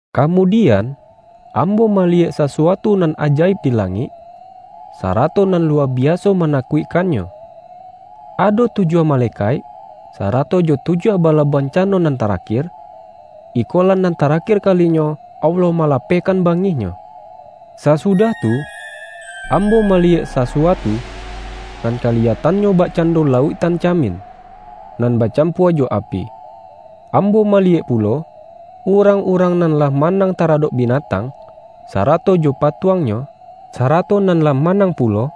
Kamudian, ambo maliyek sa-suatu nan ajaib di langik, sa-rato nan luwa biaso manakuikkan-nyo. Ado tujuah malekaik, sarato jo tujuah bala bancano nan tarakir. Iko-lah nan tarakir kalinyo Allah mala-pehkan bangih-Nyo. Sasudah tu, ambo maliyek sasu-atu, nan kaliyatannyo bakcando la-uiktan camin, nan bacampua jo api. Ambo maliyek pulo, urang-urang nan lah manang taradok binatang, sara-to jo patuangnyo, sarato nan lah ma-nang pulo,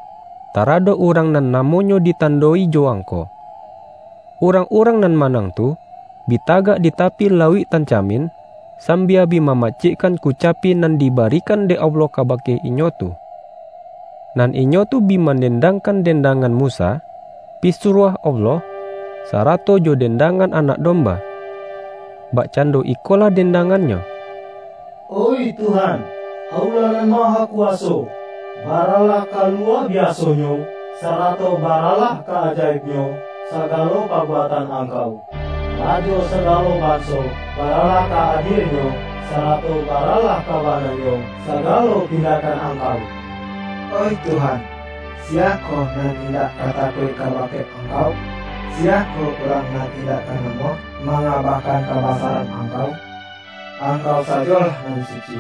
taradok urang nan namo-nyo ditando-i jo angko. Urang-urang nan manang tu, bi tagak di tapi lauik-tan camin, sambia bi mamacikkan ku-capi nan dibarikan dek Allah kabake inyo tu. Nan inyo tu bi mandendang-kan dendangan Musa, pisuruah Allah, sarato jo dendangan Anak Domba. Bakcando ikolah dendangannyo,”Oih Tuhan, Allah nan Mahakuwaso, baralah ka luwa biasonyo, sarato baralah ka-ajaibnyo, sagalo pabuatan Angkau! Rajo sagalo banso, baralah ka adienyo, sarato baralah ka bana nyo, sagalo tindakan Angkau! Oih Tuhan, siyakoh nan indak ka takuik kabake Angkau? Siyakoh urang nan indak ka namuah mangabakan kabasaran Angkau? Angkau sajolah nan suci.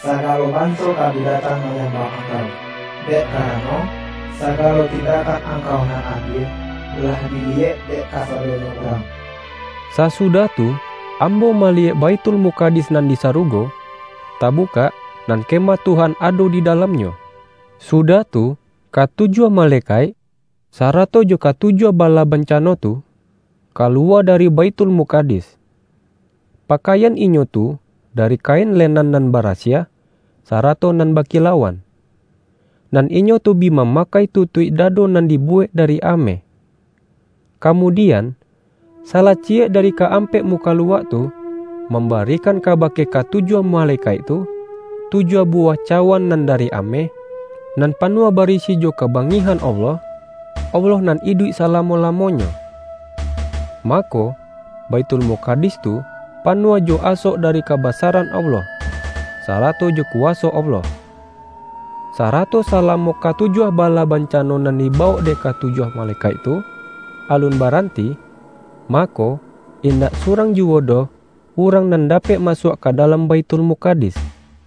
Sagalo banso ka bi datang manyambah Angkau, dek karano, sagalo tindakan Angkau nan adie, lah diliyek dek kasadonyo urang.” Sasudah tu, ambo maliyek Baithul-mukadis nan di sarugo, tabukak, nan Kemah Tuhan ado di dalamnyo. Su-dah tu, katujuah malekaik, sarato jo katujuah bala bancano tu, kaluwa da-ri Baithulmukadis. Pakaian inyo tu dari kain lenan nan barasiah, sara-to nan bakilauan. Nan inyo tu bi ma-makai tutuik dado nan dibuwek da-ri ameh. Kamudian, salah ciyek dari ka-ampek mukaluak tu, mambarikan kabake katujuah malekaik tu, tujuah buwah cawan nan dari ameh, nan panuah barisi jo kabangihan Allah, Allah nan iduik salamo-lamonyo. Mako, Baithulmukadis tu panuah jo asok dari kabasaran Allah, sarato jo kuwaso Allah. Sarato salamo katu-juah bala bancano nan dibawok dek katujuah malekaik tu, alun baranti, mako, indak surang juwo doh urang nan dapek masuak ka dalam Baithul-mukadis.